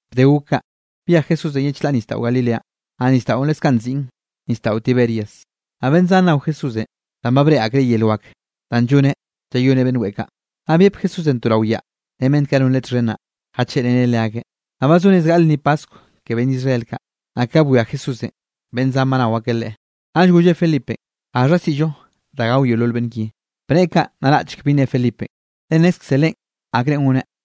Bde gok kaꞌ, byej Jesúsenꞌ ye chlaꞌ nisdaꞌo Galileanꞌ. Naꞌ nisdaꞌon leskaꞌ nziꞌn nisdaꞌo Tiberias. Naꞌ beꞌnn zan nao Jesúsenꞌ danꞌ ba breꞌe akreꞌ yel wak danꞌ lloneꞌ llayoneꞌ beꞌnn weꞌe kaꞌ. Naꞌ byep Jesúsenꞌ to rao yaꞌ ren beꞌnn kaꞌ non Leꞌe txhen naꞌ, jacheꞌreneꞌ leakeꞌ. Naꞌ ba zo rez gaꞌle lnni paskw ke beꞌnn Israel kaꞌ. Naꞌ ka bwia Jesúsenꞌ beꞌnn zan ba nao ak Leꞌe, naꞌll golleꞌ Felipenꞌ: —¿Gaxha siꞌllo da gao yeolol beꞌnn ki? Bneꞌe kaꞌ naraꞌchek bi ne Felipenꞌ, le nnezkze Leꞌen akrenꞌ goneꞌ.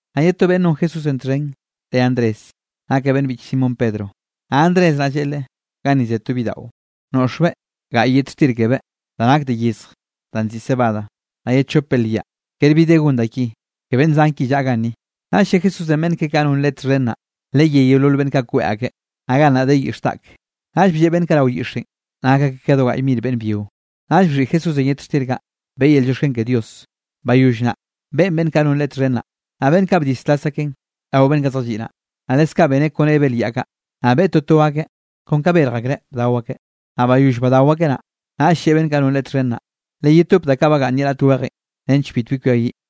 Naꞌ ye to beꞌnn non Jesúsenꞌ txhen reꞌe Andrés, nakeꞌ beꞌnn biꞌch Simón Pedro. Naꞌ Andrés naꞌ lleꞌe Leꞌe: —Ganni ze to bidaꞌo, noꞌxbeꞌ gaꞌy yet xtir kebeꞌ da nak de yezj danꞌ nziꞌi cebada, naꞌ ye chop belyaꞌ. Kere bi de gon da ki ke beꞌnn zan ki llaꞌa ganni. Naꞌll lle Jesúsenꞌ beꞌnn keꞌe kaꞌ non Leꞌe txhen naꞌ: —Leyé yeolol beꞌnn kaꞌ kweꞌ akeꞌ. Naꞌ gannaꞌ de yix dak, naꞌll blleꞌ beꞌnn kaꞌ rao yixenꞌ, nak akeꞌ ka do gaꞌy mir beꞌnn byio. Naꞌll bxhiꞌi Jesúsenꞌ yet xtir kaꞌ, beꞌe yel llioxken ke Dios. Bayoll naꞌ, beꞌen beꞌnn kaꞌ non Leꞌe txhen naꞌ, naꞌ beꞌnn kaꞌ bdislas akeꞌn rao beꞌnn kaꞌ zjalliꞌ naꞌ. Naꞌ leskaꞌ beneꞌ kone belyaꞌ kaꞌ, naꞌ beꞌe totoeꞌ kon ka berj akreꞌ bdao akeꞌ. Naꞌ bayoll badao akeꞌ naꞌ, naꞌll lleꞌe beꞌnn kaꞌ non Leꞌe txhen naꞌ: —Leyetop da kaꞌ bagaꞌnn ye raꞌt wejen nench bitbi kwiayiꞌ.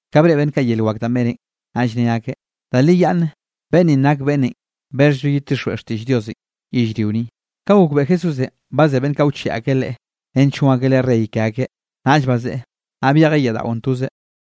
Ka breꞌe beꞌnn kaꞌ yel wak danꞌ beneꞌn, naꞌll ne akeꞌ: —Da li yaꞌnne beꞌnn ninꞌ nak beꞌnnenꞌ bexhllo yedtixjweꞌ lliꞌo xtiꞌll Diosenꞌ yellrio ni. Ka gokbeꞌe Jesúsenꞌ ba ze beꞌnn kaꞌ wcheꞌe akeꞌ Leꞌe nench gon akeꞌ Leꞌe rey ke akeꞌ, naꞌll bazeꞌe, naꞌ byejeꞌ yaꞌ daꞌon tozeꞌ.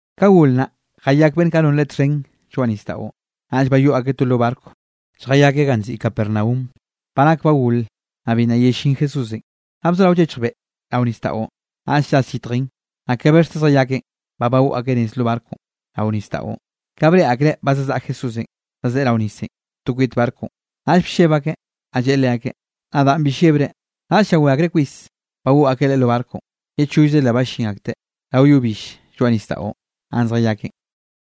Ka gol naꞌ, jayak beꞌnn kaꞌ non Leꞌe txhen lloaꞌ nisdaꞌon. Naꞌll bayoꞌ akeꞌ to lo barco lljayakeꞌ ganꞌ nziꞌi Capernaum. Ba nak ba gol, naꞌ bi nna yellín Jesúsenꞌ. Naꞌ bzorao llechj beꞌ rao nisdaꞌon, naꞌll llas yitjen. Naꞌ ka bexte zjayakeꞌn ba bagoꞌ akeꞌ nez lo barconꞌ rao nisdaꞌon, ka breꞌe akreꞌ ba zazaꞌa Jesúsenꞌ zazeꞌe rao nisenꞌ to kwit barconꞌ, naꞌll blleb akeꞌ. Naꞌll lleꞌe leakeꞌ: —Nadaꞌn, bi llebre. Naꞌll llawé akreꞌ kwis, bagoꞌ akeꞌ Leꞌe lo barconꞌ. Ye chollze le ballín akteꞌ rao yo bill lloaꞌ nisdaꞌon ganꞌ zjayakeꞌn.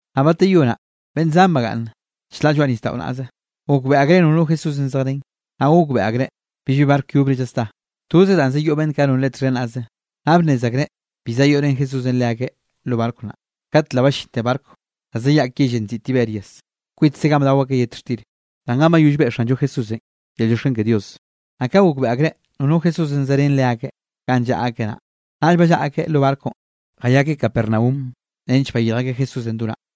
Naꞌ bateyó naꞌ, beꞌnn zan bagaꞌnn chlaꞌ lloaꞌ nisdaꞌo naꞌze, gokbeꞌe akreꞌ nono Jesúsenꞌ zejrén, naꞌ gokbeꞌe akreꞌ billbi barco yobre llasdá, toze danꞌ zayoꞌ beꞌnn kaꞌ non Leꞌe txhen naꞌze, naꞌ bnnez akreꞌ bi zayoꞌ ren Jesúsenꞌ leakeꞌ lo barco naꞌ. Kat le ballinte barco da zayaꞌk yellenꞌ nziꞌi Tiberias kwitze ganꞌ bdao akeꞌ yet xtir, danꞌ ganꞌ bayoll beꞌe Xanllo Jesúsenꞌ yel llioxken ke Dios. Naꞌ ka gokbeꞌe akreꞌ nono Jesúsenꞌ zerén leakeꞌ ganꞌ llaꞌa akeꞌ naꞌ, naꞌll ballaꞌa akeꞌ lo barconꞌ jayakeꞌ Capernaum nench bayirj akeꞌ Jesúsenꞌ do naꞌ.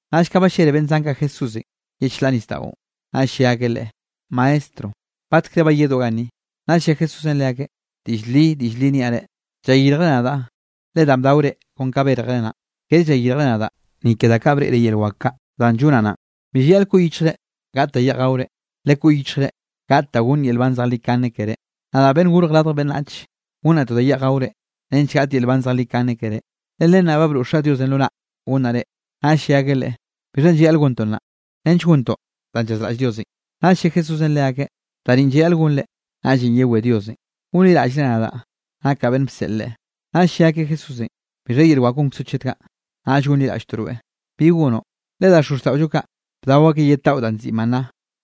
Naꞌll ka ballele beꞌnn zan kaꞌ Jesúsenꞌ ye chlaꞌ nisdaꞌon, naꞌll lle akeꞌ Leꞌe: —Maestro, ¿batkre bayedoꞌ ganni? Naꞌll lle Jesúsenꞌ leakeꞌ: —Diꞌll li, diꞌll li niaꞌ reꞌ, llayirjre nadaꞌ le danꞌ bdaore kon ka bérjere naꞌn, kere llayirjre nadaꞌ ni ke da kaꞌ breꞌre yel wak kaꞌ danꞌ llonaꞌ naꞌn. Bi llayaꞌl koꞌ yichjre gaꞌt da yeꞌj gaore, lekoꞌ yichjre gaꞌt da gonn yel nban zejlikane keré. Nadaꞌ Beꞌnnenꞌ Gorj Radj Beꞌnnach, gonnaꞌ to da yeꞌj gaore, nench gaꞌt yel nban zejlikane keré. Le len naꞌ, ba broꞌ Xaꞌ Diosenꞌ lo naꞌ gonnaꞌ reꞌ. Naꞌll lle akeꞌ Leꞌe: —¿Bixhanꞌ llayaꞌl gontoꞌ naꞌ, nench gontoꞌ danꞌ llazraꞌll Diosenꞌ? Naꞌll lle Jesúsenꞌ leakeꞌ: —Da ninꞌ llayaꞌl gonre, naꞌllenꞌ yewé Diosenꞌ, gonliraꞌllre nadaꞌ nakaꞌ beꞌnn bseꞌl Leꞌe. Naꞌll lle akeꞌ Jesúsenꞌ: —¿Bixha yel wak gonkzoꞌ chet kaꞌ, naꞌll gonliraꞌlltoꞌ rweꞌ? ¿Bi gonoꞌ? Le da xozxtaꞌollo kaꞌ, bdao akeꞌ yet daꞌo danꞌ nziꞌi maná,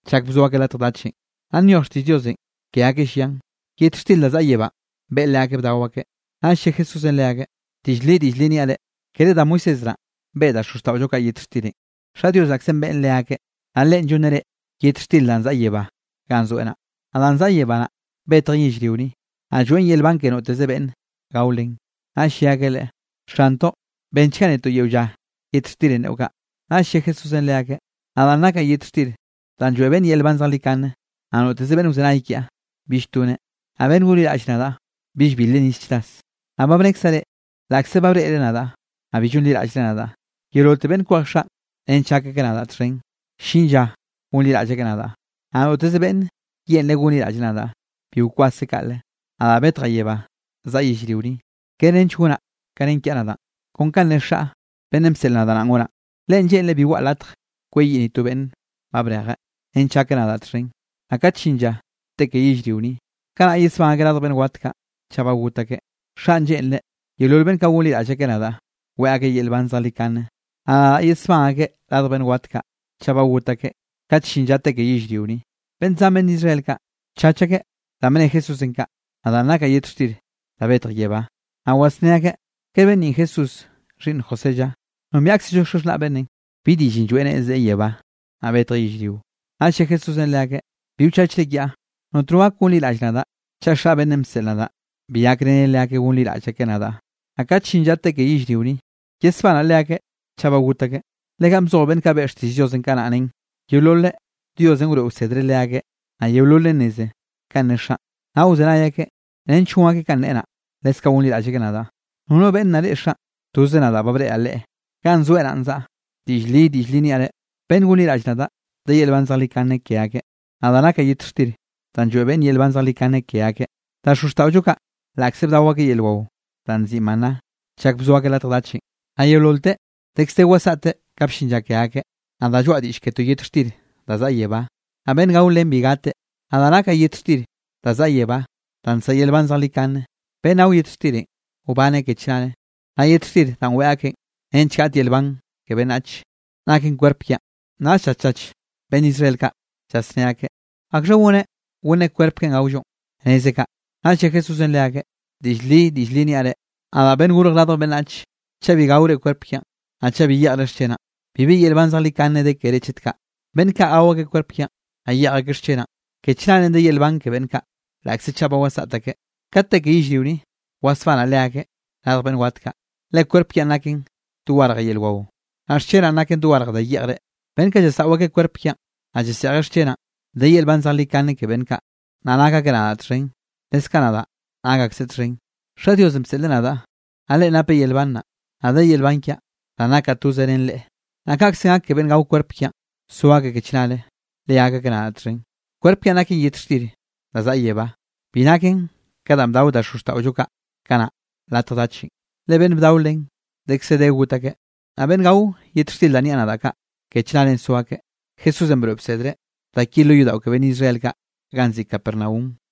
chak bzo akeꞌ latj dachenꞌ, naꞌ nyoj xtiꞌll Diosenꞌ ke akeꞌ llian: “Yet xtir da zaꞌa yebánꞌ beꞌe leakeꞌ bdao akeꞌ.” Naꞌll lle Jesúsenꞌ leakeꞌ: —Diꞌll li, diꞌll li niaꞌ reꞌ: Kere da Moisés naꞌn beꞌe da xozxtaꞌollo kaꞌ yet xtirenꞌ, Xaꞌ Dios naꞌkzenꞌ beꞌen leakeꞌ. Naꞌ Leꞌen llonneꞌ reꞌ yet xtirenꞌ danꞌ zaꞌa yebá ganꞌ zoeꞌ naꞌ. Naꞌ danꞌ zaꞌa yebá naꞌ, betjen yellrio ni, naꞌ lloeꞌn yel nban ke noteze beꞌnn gao len. Naꞌll lle akeꞌ Leꞌe: —Xantoꞌ, bennchga netoꞌ yeo lla yet xtirenꞌ neꞌo kaꞌ. Naꞌll lle Jesúsenꞌ leakeꞌ: —Nadaꞌn nakaꞌ yet xtir danꞌ lloeꞌ beꞌnn yel nban zejlikane. Naꞌ noteze beꞌnn wzenay kiaꞌ bill toneꞌ, naꞌ beꞌnn gonliraꞌll nadaꞌ, bill bilreꞌ nis chras. Naꞌ ba bnekzaꞌ reꞌ, laꞌkze ba breꞌre nadaꞌ, naꞌ bi llonliraꞌllre nadaꞌ. Yeololte beꞌnn kwej Xaꞌn nench gak akeꞌ nadaꞌ txhen, ll-llin lla gonliraꞌll akeꞌ nadaꞌ, naꞌ noteze beꞌnne yeꞌnreꞌ gonliraꞌlleꞌ nadaꞌ, bi wkwaseꞌ kaꞌle. Nadaꞌ betjaꞌ yebá zaꞌa yellrio ni, kere nench gonaꞌ ka nen kiaꞌ nadaꞌn, kon kanꞌ ne Xaꞌ beꞌnnenꞌ bseꞌl nadaꞌ naꞌn gonaꞌ. Leꞌen lleꞌnreꞌ bi waꞌa latje kweyiꞌ ni to beꞌnn ba brejeꞌ, nench gak akeꞌ nadaꞌ txhen. Naꞌ kat llin lla te ke yellrio ni, kanaꞌ yesbán akeꞌ radj beꞌnn wat kaꞌ, chaꞌ ba got akeꞌ. Xaꞌn lleꞌnreꞌ yeolol beꞌnn kaꞌ gonliraꞌll akeꞌ nadaꞌ, weꞌe akeꞌ yel nban zejlikane, naꞌ nadaꞌ yesbán akeꞌ radj beꞌnn wat kaꞌ, chaꞌ ba got akeꞌ kat llin lla te ke yellrio ni. Beꞌnn zan beꞌnn Israel kaꞌ, bchach akeꞌ danꞌ bne Jesúsenꞌ kaꞌ: “Nadaꞌ nakaꞌ yet xtir danꞌ betj yebá.” Naꞌ wasné akeꞌ: —¿Kere beꞌnn ninꞌ Jesús, xhiꞌnn José lla? Nombiaꞌkzllo xaxhnaꞌ beꞌnnenꞌ. ¿Bi diꞌllenꞌ lloeꞌ neꞌe, zeꞌe yebá, naꞌ betjeꞌ yellrio? Naꞌll lle Jesúsenꞌ leakeꞌ: —Bi wchachre kiaꞌ. Notno gak gonliraꞌll nadaꞌ, chaꞌ Xaꞌ beꞌnnenꞌ bseꞌl nadaꞌ, bi gakreneꞌ leakeꞌ gonliraꞌll akeꞌ nadaꞌ, naꞌ kat llin lla te ke yellrio ni, yesbanaꞌ leakeꞌ chaꞌ ba got akeꞌ. Le ganꞌ bzoj beꞌnn kaꞌ beꞌe xtiꞌll Diosenꞌ kanaꞌ nen: “Yeololeꞌ, Diosenꞌ wroeꞌ wsedreꞌ leakeꞌ.” Naꞌ yeololeꞌ nneze kanꞌ ne Xaꞌn, naꞌ wzenay akeꞌ nench gon akeꞌ kanꞌ neꞌe naꞌ, leskaꞌ gonliraꞌll akeꞌ nadaꞌ. ’Nono beꞌnn nna reꞌe Xaꞌn. Toze nadaꞌ ba breꞌreꞌ le ganꞌ zoeꞌ naꞌn zaꞌa. Diꞌll li, diꞌll li niaꞌ reꞌ: Beꞌnn gonliraꞌll nadaꞌ, de yel nban zejlikane ke akeꞌ. Nadaꞌ nakaꞌ yet xtir danꞌ lloeꞌ beꞌnne yel nban zejlikane ke akeꞌ. Da xozxtaꞌollo kaꞌ, laꞌkze bdao akeꞌ yel wao da nziꞌi maná chak bzo akeꞌ latj dachenꞌ, naꞌ yeololteꞌ dekz de wasaꞌte ka bllin lla ke akeꞌ. Nadaꞌ lloaꞌ diꞌll ke to yet xtir da zaꞌa yebá, naꞌ beꞌnn gao len bi gateꞌ. Nadaꞌn nakaꞌ yet xtir da zaꞌa yebánꞌ danꞌ nsaꞌa yel nban zejlikane. Beꞌnn gao yet xtirenꞌ, wbaneꞌ ke chnare. Naꞌ yet xtir danꞌ weꞌe akeꞌn nench gaꞌt yel nban ke beꞌnnach, naken kwerp kiaꞌn. Naꞌll llaschach beꞌnn Israel kaꞌ llasné akeꞌ: —¿Akxha goneꞌ gonneꞌ kwerp keꞌen gaollon, nezeꞌ kaꞌ? Naꞌll lle Jesúsenꞌ leakeꞌ: —Diꞌll li, diꞌll li niaꞌ reꞌ: Nadaꞌ Beꞌnnenꞌ Gorj Radj Beꞌnnach, chaꞌ bi gaore kwerp kiaꞌn, naꞌ chaꞌ bi yeꞌjre xchenaꞌn, bibi yel nban zejlikane de keré chet kaꞌ. Beꞌnn kaꞌ gao akeꞌ kwerp kiaꞌn, naꞌ yeꞌj akeꞌ xchenaꞌn, ke chnare de yel nban ke beꞌnn kaꞌ, laꞌkze chaꞌ ba wasaꞌt akeꞌ, kat te ke yellrio ni, wasbanaꞌ leakeꞌ radj beꞌnn wat kaꞌ. Le kwerp kiaꞌn naken dogarje yel wao, naꞌ xchenaꞌn naken dogarje da yeꞌjre. Beꞌnn kaꞌ llasaꞌo akeꞌ kwerp kiaꞌn, naꞌ llaseꞌjeꞌ xchenaꞌn, de yel nban zejlikane ke beꞌnn kaꞌ, naꞌ nak akeꞌ nadaꞌ txhen, leskaꞌ nadaꞌ nak akseꞌ txhen. Xaꞌ Diosenꞌ bseꞌleꞌ nadaꞌ, naꞌ Leꞌen napeꞌ yel nban naꞌ, naꞌ de yel nban kiaꞌ danꞌ nakaꞌ toze ren Leꞌe. Naꞌ kaꞌkze gak ke beꞌnn gao kwerp kiaꞌn, so akeꞌ ke chnare, le gak akeꞌ nadaꞌ txhen. Kwerp kiaꞌn naken yet xtir da zaꞌa yebá, bi naken ka danꞌ bdao da xozxtaꞌollo kaꞌ kanaꞌ latj dachenꞌ, le beꞌnn bdao len dekze de got akeꞌ. Naꞌ beꞌnn gao yet xtir danꞌ niaꞌ nadaꞌ kaꞌ, ke chnare so akeꞌ. Jesúsenꞌ broeꞌ bsedreꞌ da ki lo yodaꞌo ke beꞌnn Israel kaꞌ ganꞌ nziꞌi Capernaum.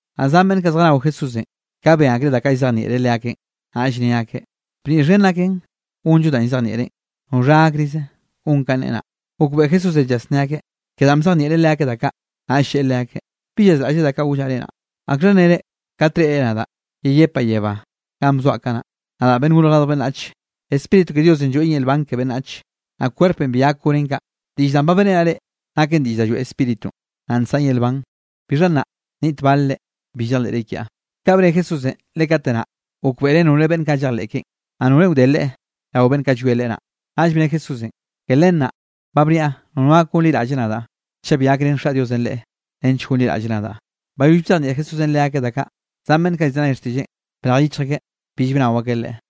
Naꞌ zan beꞌnn kaꞌ zjanao Jesúsenꞌ, ka ben akreꞌ da kaꞌ llzejnieꞌreꞌ leakeꞌn, naꞌll ne akeꞌ: —Bniꞌ xhen naken gonllo danꞌ llzejnieꞌreꞌn. ¿Noxha gakrize gon kanꞌ neꞌe naꞌ? Gokbeꞌe Jesúsenꞌ llasnné akeꞌ ke danꞌ bzejnieꞌreꞌ leakeꞌ da kaꞌ, naꞌll lleꞌe leakeꞌ: —¿Bi llazraꞌllre da kaꞌ gollaꞌ reꞌ naꞌn? ¿Akxha nnere kat reꞌre nadaꞌ yeyepaꞌ yebá ganꞌ bzoaꞌ kanaꞌ, nadaꞌ Beꞌnnenꞌ Gorj Radj Beꞌnnach? Spíritu ke Diosenꞌ lloeꞌn yel nban ke beꞌnnach, naꞌ kwerpenꞌ bi gak gonen kaꞌ. Diꞌll danꞌ ba beꞌrenaꞌ reꞌ, naken diꞌll da lloeꞌ Spíritunꞌ, naꞌ nsaꞌn yel nban. Bixha nna niꞌt bale reꞌ, bi llejleꞌre kiaꞌ. Kaꞌ bne Jesúsenꞌ le kate naꞌ, gokbeꞌreꞌ nore beꞌnn kaꞌ llejleꞌ keꞌen, naꞌ norenꞌ wde Leꞌe rao beꞌnn kaꞌ llwie Leꞌe naꞌ. Naꞌll bne Jesúsenꞌ: —Ke len naꞌ, ba bniaꞌ nono gak gonliraꞌlle nadaꞌ, chaꞌ bi gakrén Xaꞌ Diosenꞌ leꞌe nench gonliraꞌlleꞌ nadaꞌ. Bayoll bzejnieꞌ Jesúsenꞌ leakeꞌ da kaꞌ, zan beꞌnn kaꞌ llzenay xtiꞌlleꞌn, brej yichj akeꞌ bill bnao akeꞌ Leꞌe.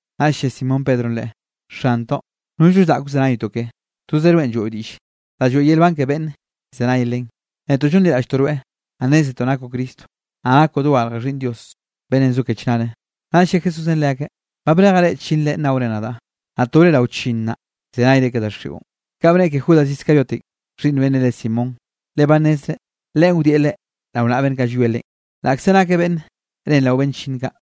Naꞌll lle Simón Pedronꞌ Leꞌe: —Xantoꞌ, nollno zaꞌk wzenaytoꞌ keꞌe. Tozoꞌ rweꞌn lloeꞌo diꞌll da lloeꞌ yel nban ke beꞌnn llzenay len. Netoꞌ llonliraꞌlltoꞌ rweꞌ, naꞌ nnézetoꞌ nakoꞌ Cristo, naꞌ nakoꞌ dogarje Xhiꞌnn Dios beꞌnnenꞌ zo ke chnare. Naꞌll lle Jesúsenꞌ leakeꞌ: —Ba brejaꞌ reꞌ chllinnre nnaore nadaꞌ, naꞌ to reꞌ rao chllinn naꞌ, llzenayre ke daxiꞌon. Kanꞌ bneꞌe ke Judas Iscariotenꞌ xhiꞌnn beꞌnnenꞌ re Simón, le ba nnezreꞌ, leꞌen wdieꞌ Leꞌe rao naꞌa beꞌnn kaꞌ llwie Leꞌen, laꞌkze nakeꞌ beꞌnn ren rao beꞌnn chllinn kaꞌ.